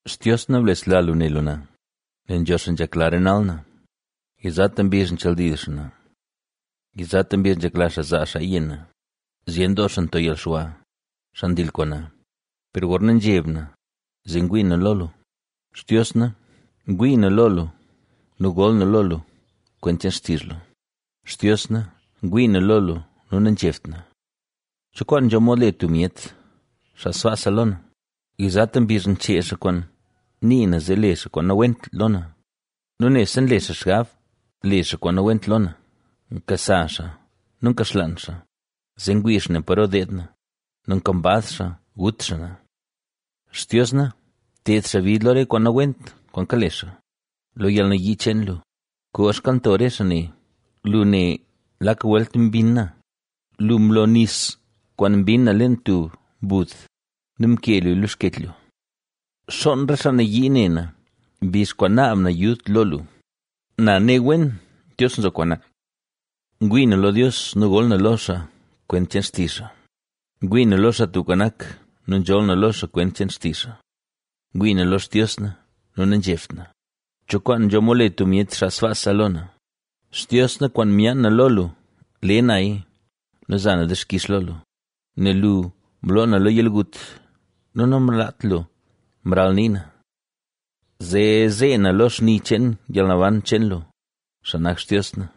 Xtios na blesla lu ne lu na, nel nzho xaa nzhekla renal na, yizata mbizh nchaldil xaa na. Yizata mbizh nzhekla xaa zaa xaaya yenn na; ¡zyen doo xaa nto yalxwa, xaa ndil kwaan na! Per gorna nzheb na, zee ngwii na lo lu. Xtios na, ngwii na lo lu nu gol na lo lu kwent cheen xtizh lu; Xtios na, ngwii na lo lu nu nazhebt na. ¿Cho kwaan nzho mod le tub myet, xaa sbaasa lo na? Yizata mbizh nchee xaa kwaan nii na zee le xaa kwaan nawent lo na nu nebse nle xaa xgab le xaa kwaan nawent lo na. Nkasa xaa nu nkaxlaan xaa, zee ngwii xaa ne paro deed na nu nkambaz xaa gut xaa na. ¡Xtios na, bted xaa bid lo re kwaan nawent kwaan kale xaa, lo yalnayii cheen lu, koo xkalnto re xaa ne! Lu ne lak welt mbinn na; lu mlo nis kwaan mbinn na leen tub mbud nu mkee luya lo xkech lu. Xoon re xaa nayii ne na, mbizh kwaan naab na yud lo lu; na ne wen Dios nzo kwaan na. Ngwii na lo Dios nu gol na lo xaa kwent cheen xtizh xaa; ngwii na lo Xaa Tubka Nak, nu nzholl na lo xaa kwent cheen xtizh xaa. Ngwii na lo lu Xtios na, nu nazhebt na. ¿Cho kwaan nzho mod le tub myet xaa sbaasa lo na? Xtios na, kwaan myaan na lo lu, le naya nu za na dixkix lo lu, nel lu mloo na lo yalgut nu namlaat lu mralnii na, zee zee na lo xni cheen yalnaban cheen lu, xaa nak Xtios na.